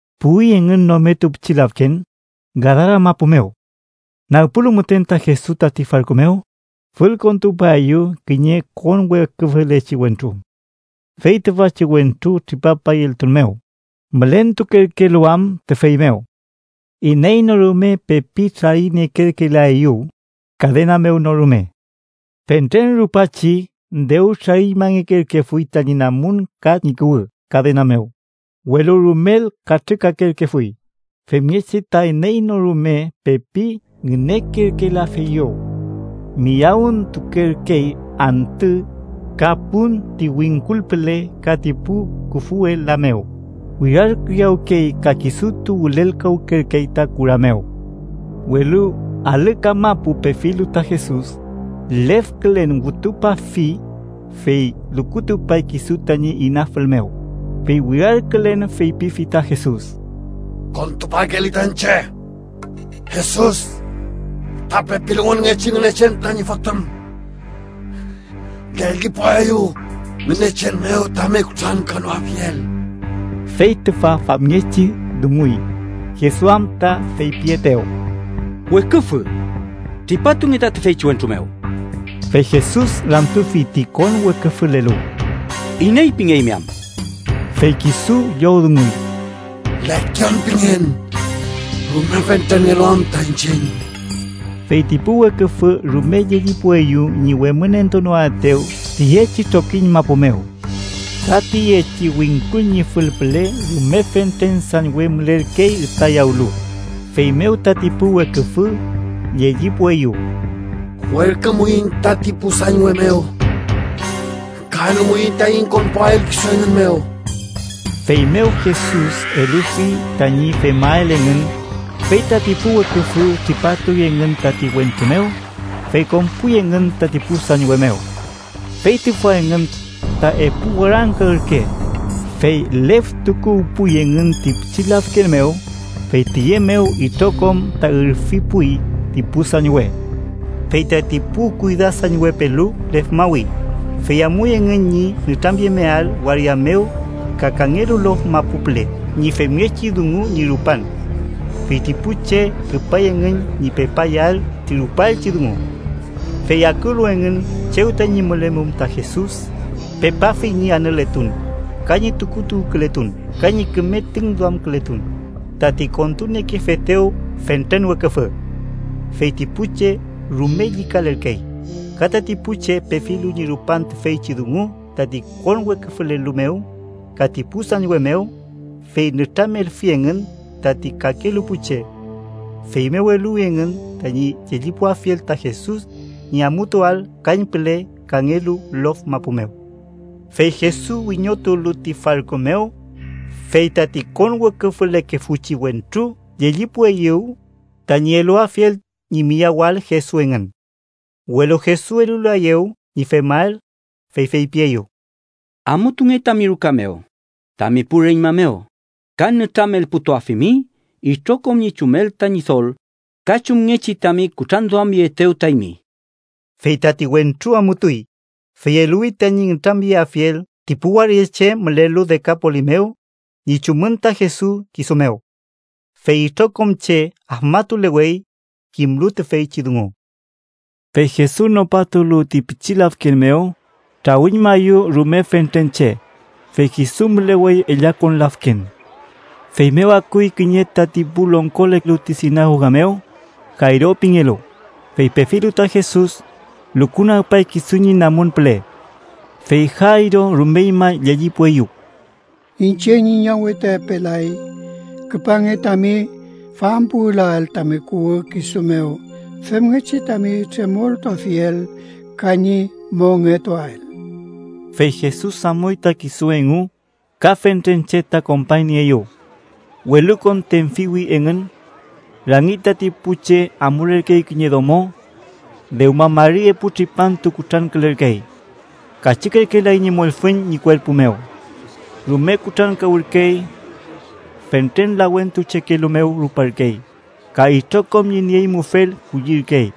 Puwi engün nometu pichi lafken, Gadaramapu mew. Nagpulu müten ta Jesus tati farku mew, fülkontupaeyew kiñe konweküfülechi wentru. Fey tüfachi wentru tripapay eltun mew, mülentukerkelu am tüfey mew. Iney no rume pepi trariniekerkelaeyew, kadena mew no rume. Fentren rupachi dew trariñmangekerkefuy tañi namun ka ñi kuwü kadena mew, welu rumel katrükakerkefuy femngechi ta iney no rume pepi ngünekerkelafeyew. Miyawüntukerkey antü ka pun ti wingkul püle ka ti pu küfwe la mew, wirarkiyawkey ka kisutu wülelkawkerkey ta kura mew. Welu alü kamapu pefilu ta Jesus, lefkülen wütupafi, fey lukutupay kisu tañi inafül mew, fey wirarkülen feypifi ta Jesus: —¡Kontupakeeli ta iñche, Jesus, fütra pepiluwünngechi Ngünechen tañi Fotüm! ¡Llellipuaeyu Ngünechen mew tami kutrankanoafiel! Fey tüfa famngechi dunguy, Jesus am ta feypietew: —¡Weküfü, tripatunge ta tüfeychi wentru mew! Fey Jesus ramtufi ti konweküfülelu: —¿Iney pingeymi am? Fey kisu llowdunguy: —Lekion pingen, rume fentrenngelu am ta iñchiñ. Fey ti pu weküfü rume llellipueyew ñi wemünentunoaetew tiyechi trokiñ mapu mew. Ka tiyechi wingkul ñi fül püle, rume fentren sañwe mülerkey ütayawlu, feymew tati pu weküfü llellipueyew: —Werkümuiñ tati pu sañwe mew ka elumuiñ taiñ konpuael kisu engün mew. Feymew Jesus elufi tañi femael engün, fey tati pu weküfü tripatuy engün tati wentru mew, fey konpuy engün tati pu sañwe mew. Fey tüfa engün, ta epu warangka ürke, fey leftukuwpuy engün ti pichi lafken mew, fey tiye mew itrokom ta ürfipuy ti pu sañwe. Fey tati pu kuydasañwepelu lefmawi, fey amuy engün ñi nütramyemeael waria mew ka kangelu lof mapu püle ñi femngechi dungu ñi rupan. Fey ti pu che küpay engün ñi pepayael ti rupaelchi dungu. Fey akulu engün chew tañi mülemum ta Jesus, pepafi engün ñi anületun, ka ñi tukuluwkületun ka ñi küme tüngduamkületun tati kontuniekefetew fentren weküfü. Fey ti pu che rume llükalerkey, ka tati pu che pefilu ñi rupan tüfeychi dungu tati konweküfülelu mew ka ti pu sañwe mew, fey nütramelfi engün tati kakelu pu che. Feymew eluwi engün tañi llellipuafiel ta Jesus ñi amutuael kañpüle kangelu lof mapu mew. Fey Jesus wiñotulu ti farku mew, fey tati konweküfülekefuchi wentru llellipueyew tañi eluafiel ñi miyawael Jesus engün. Welu Jesus elulaeyew ñi femael, fey feypieyew: —Amutunge tami ruka mew, tami pu reñma mew, ka nütramelputuafimi itrokom ñi chumel ta Ñidol, ka chumngechi tami kutranduamyeetew ta eymi. Fey tati wentru amutuy, fey eluwi tañi nütramyelafiel ti pu waria che mülelu Dekapolis mew ñi chumün ta Jesus kisu mew. Fey itrokom che afmatulewey, kimlu tüfeychi dungu. Fey Jesus nopatulu ti pichi lafken mew, trawüñmaeyew rume fentren che, fey kisu mülewey ellakon lafken. Feymew akuy kiñe tati pu longkolelu ti sinagoga mew, Jayro pingelu, fey pefilu ta Jesus, lukunagpay kisu ñi namun püle. Fey Jayro rumeñma llellipueyew: —Iñche ñi ñawe ta epe lay. Küpange tami fampuwülael tami kuwü kisu mew, femngechi tami tremoltuafiel ka ñi mongetuael. Fey Jesus amuy ta kisu engu, ka fentren che ta kompañnieeyew. Welukon tenfiwi engün. Rangi tati pu che amulerkey kiñe domo. Dewma mari epu tripantu kutrankülerkey; kachükerkelay ñi mollfüñ ñi kuerpu mew. Rume kutrankawürkey. Fentren lawentuchekelu mew ruparkey, ka itrokom ñi nieñmufel kullirkey,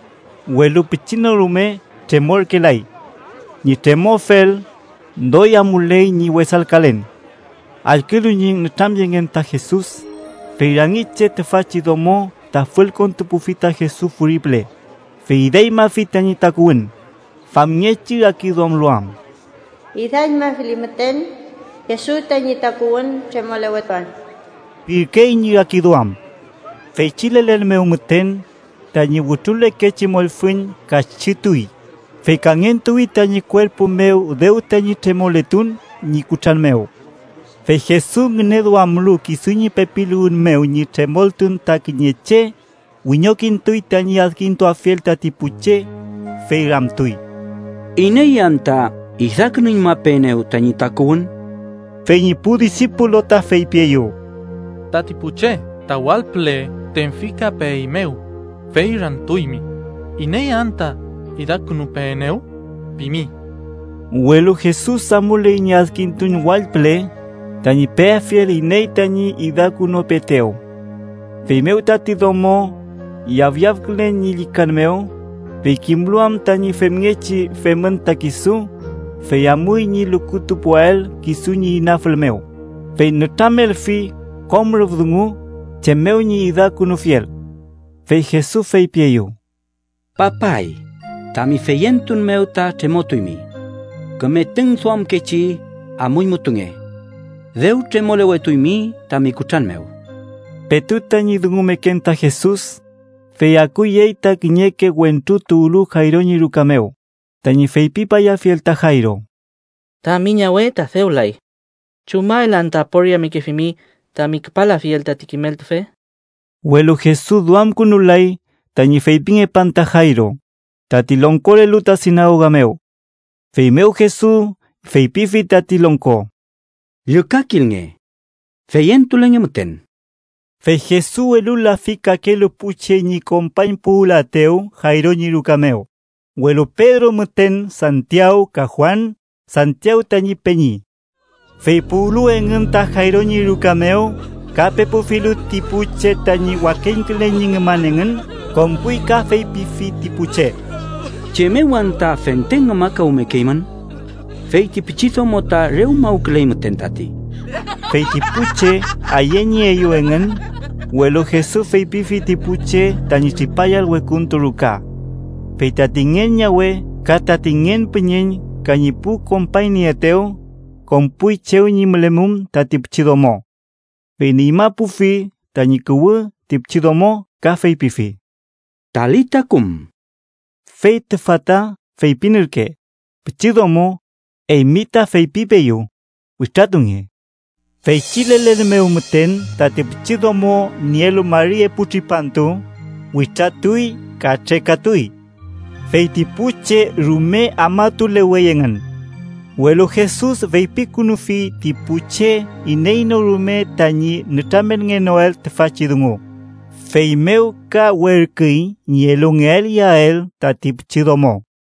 welu pichi no rume tremorkelay. Ñi tremoafel, doy amuley ñi wesalkalen. Allkülu ñi nütramyengen ta Jesus, fey rangi che tüfachi domo ta fülkontupufi ta Jesus furi püle, fey idañmafi tañi takuwün, famngechi rakiduamlu am: “Idañmafili müten Jesus tañi tukuwün, tremolewetuan” pirkey ñi rakiduam. Feychi lelen mew müten, tañi wütrulekechi mollfüñ kachütuy, fey kangentuwi tañi kuerpu mew dew tañi tremoletun ñi kutran mew. Fey Jesus, ngüneduamlu kisu ñi pepiluwün mew ñi tremoltun ta kiñe che, wiñokintuy tañi adkintuafiel tati pu che, fey ramtuy: —¿Iney anta idakünuñmapeenew tañi takuwün? Fey ñi pu disipulu ta feypieyew: —Tati pu che ta wall püle tenfikapeeymew, fey ramtuymi, ‘¿Iney anta idakünupeenew?’ pimi. Welu Jesus amuley ñi adkintun wall püle, tañi peafiel iney tañi idakünupeetew. Feymew tati domo, yafyafkülen ñi llükan mew, fey kimlu am tañi femngechi femün ta kisu, fey amuy ñi lukutupuael kisu ñi inafül mew, fey nütramelfi kom rüf dungu chem mew ñi idakünufiel. Fey Jesus feypieyew: —Papay, tami feyentun mew ta tremotuymi. Küme tüngduamkechi amuñmutunge. Dew tremolewetuymi tami kutran mew. Petu tañi dungumeken ta Jesus, fey akuyey ta kiñeke wentru tuwlu Jayro ñi ruka mew, tañi feypipayafiel ta Jayro: —Tami ñawe ta dew lay. ¿Chumael anta aporiamekefimi tami küpalafiel tati Kimeltufe? Welu Jesus duamkünulay tañi feypingepan ta Jayro, tati longkolelu ta sinagoga mew. Feymew Jesus feypifi tati longko: —Llükakilnge. Feyentulenge müten. Fey Jesus elulafi kakelu pu che ñi kompañpuwülaetew Jayro ñi ruka mew, welu Pedro müten Santiaw ka Juan, Santiaw tañi peñi. Fey puwlu engün ta Jayro ñi ruka mew ka pepufilu ti pu che tañi wakeñkülen ñi ngüman engün, konpuy ka feypifi ti pu che: —¿Chem mew anta fente ngümakawmekeymün? Feyti pichidomo ta re umawküley müten tati. Fey ti pu che ayeñeeyew engün, welu Jesus feypifi ti pu che tañi tripayael wekuntu ruka. Fey tati ngen ñawe ka tati ngen püñeñ ka ñi pu kompañnieetew, konpuy chew ñi mülemum tati pichidomo. Fey nüñmapufi tañi kuwü ti pichidomo ka feypifi: —Talita kum (fey tüfa ta feypin ürke: “Pichidomo, eymi ta feypipeeyu, witratunge”). Feychi lelen mew müten, tati pichidomo, nielu mari epu tripantu, witratuy ka trekatuy. Fey ti pu che rume afmalewey engün. Welu Jesus feypikünufi ti pu che iney no rume tañi nütramelngenoael tüfachi dungu, feymew ka werküy ñi elungeael iyael tati pichidomo.